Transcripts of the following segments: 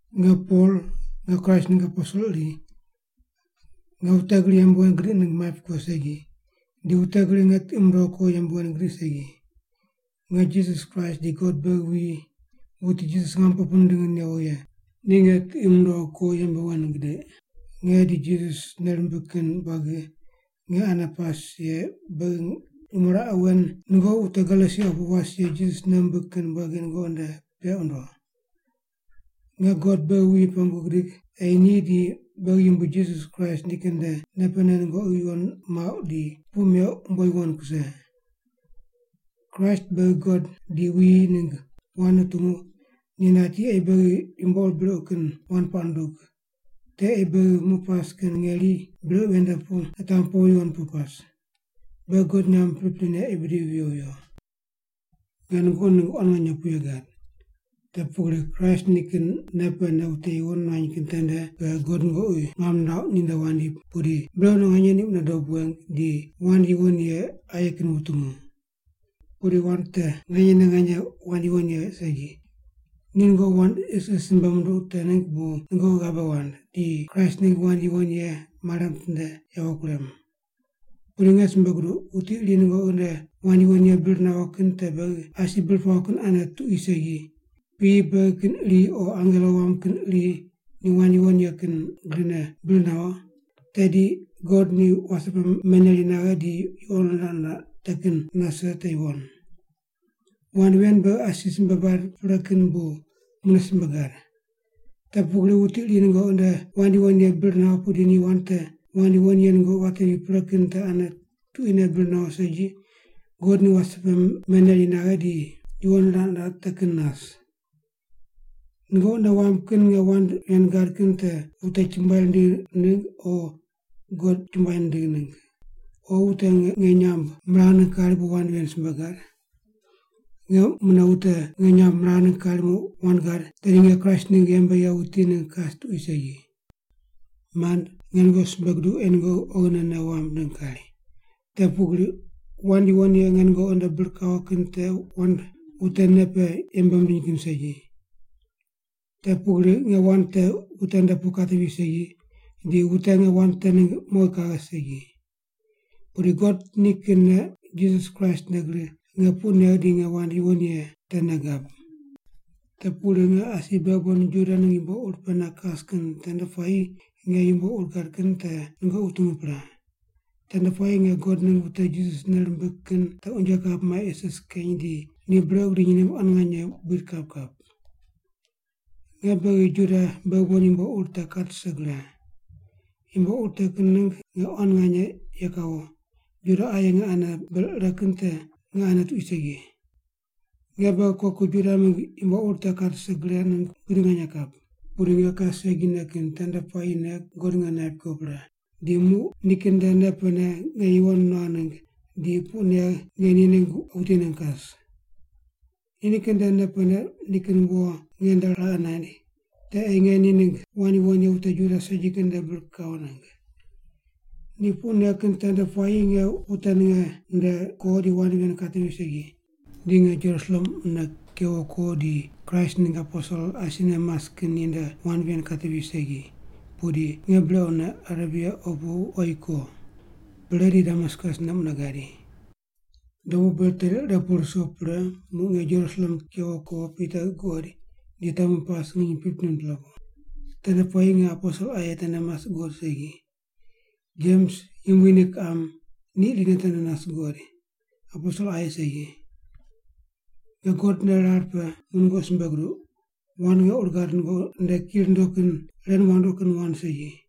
Nge Pol, nge Kraist ningg aposel iri. Nge wute gri yembe wen gidiq ningg maip ko segi, di wute gri nge tiqi mundogh ko yembe wen gidiq segi. Nge Jisas Kraist di God beghi wuyi, wuti Jisas ngamo pe pu nindingi newo ye, ni nge tiqi mundogh ko yembe wen gidiq. Nge di Jisas nei rimbig kin buagi nge ane pas ye beghi nyumo raqe wen nungoqi wute Galesia opu was ye Jisas nei wumbig kin buagi nungoqi nde peq wundo. Nge God beghi wuyi pengu gidig ei ni di beghi Yumbui Jisas Kraist nikin nde nei pene nungoqi yuwon muauq di puq meuq umbo yuwon kuse. Kraist beghi God di wuyi ningg wand nutungu ni nati ei beghi yumbo ur brequ kin wand puaq nundug, te ei beghi muq pas kin ngeri brequ ven nde pu nitamu powi yuwon pu pas. Beghi God nyamb priprine ei bidivi viyo viyo. Nge nungoqi ningg quan nganye puye gad. Te pugri Kraist nikin nei pene wute yuwon nuany kin tende pe God nungoqi ngam nirauq ninde wandi pudi brequne nganye ni mune dob weng di wand yuwon ye aye kin wutungu. Pudi wand te nganyene nganye wand yuwon ye segi. Ni nungoqi wand isis simbe munduq te ningg bu nungoqi ghabe wand, di Kraist ningg wand yuwon ye mare mitinde yawo kurem. Pudi nge simbe guduq, wuti iri nungoqi nde wand yuwon ye bir nawo kin te beghi asi bir pawo kin ane tuqui segi, piyi beghi kin iri o angelo wam kin iri ni wand yuwon ye kin grine bir nawo, tedi God ni wase pe meneri naghe di yuqo niraq niraq te kin nase te yuwon. Wand ven beghi asi simbe bad pre kin bu mune simbe gad. Te pugri wuti iri nungoqi nde wand yuwon ye bir nawo pudi ni wand te wand yuwon ye nungoqi watevi pre kin te ane tuquine bir nawo segi, God ni wase pe meneri naghe di yuqo niraq niraq te kin nas. Nungoqi nei wamb kin nge wand ven gad kin te wute chumbuai rindigh ningg o God chumbuai nindigh ningg? O wute nge nyamb miragh ningg kari bu wand ren simbe gad? Nge mune wute nge nyamb miragh ningg kari muq wand gad, tedi nge Kraist ningg yembe ye wuti ningg kas tuqui segi. Mand, nge nungoqi simbe guduq ei nungoqi oghine nei wamb ningg kari. Te pugri wand yuwon ye nge nungoqi nde bir kawo kin te wand wute nei pe yembe mindiny kin segi. Te pugri nge wand te wute nde pu katevi segi, di wute nge wand te ningg mowi kaghe segi. Pudi God nikinne Jisas Kraist nde gri nge puq negh di nge wand yuwon ye te nei gab. Te pugri nge asi beghi bon Juda ningg yumbo ur pene kas kin tende puayi nge yumbo ur gad kin te nungoqi wutungu pre. Tende puayi nge God ningg wute Jisas nei rimbig kin te unje kap mai isis keny di ni brequ gidiny ningg quan nganye buid kap kap. Nge beghi Juda beghi bon yumbo ur te kat rise gre. Yumbo ur te kin ningg nge quan nganye ye kawo, Juda aye nge ane ber ire kin te nge ane tuqui segi. Nge beghi koku Juda mingg yumbo ur te kat rise gre ningg buid nganye kap. Pudi nge kas segine kin tende puayine God nge naip ko pre, di muq nikin nde nei pene nge yuwon nuagh ningg di puq negh nge ni ningg wuti ningg kas. Ni nikin nde nei pene nikin wo nge nde raqe naind, te ei nge ni ningg wand yuwon ye wute Juda segi kin nde bir kawo ningg. Ni puq negh kin tende puayi nge wute ninge nde ko di wand ven katevi segi. Di nge Jerusalem mune kewo ko di Kraist ningg aposel asine mas kin ninde wand ven katevi segi, pudi nge brequne Arebia opu oyi ko. Pre di Damaskus ne mune gadi. Dobu ber teri ire pu ruso pre muq nge Jerusalem kewo ko Pita guqoid di temu pas nginy 15-pela pu. Tende puayi nge aposel aye tende mas guqod segi. Jems, Yumbui ni kiqam, ni irine tende nas guqoid, aposel aye segi. Nge God nde rar pe muq nungoqi simbe guduq, wand nge ur gad nungoqi nde ki rundo kin ren wandoqi kin wand segi.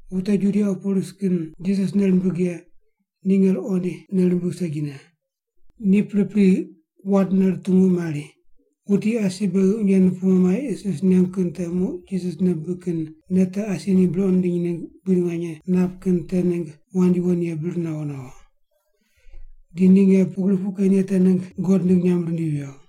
Wute Judia opu ris kin Jisas nei rimbig ye ni nge ruqoind nei rimbigh segine. Ni pripri wandne rutungu mari, “Wuti asi beghi unje nupumu mai isis nengu kin te muq Jisas nei bibig kin nei te asi ni brequ nindiny ningg buid nganye nap kin te ningg wand yuwon ye bir nawo nawo.” Di ni nge pugri puq ken ye te ningg God ningg nyamb rindivi viyo.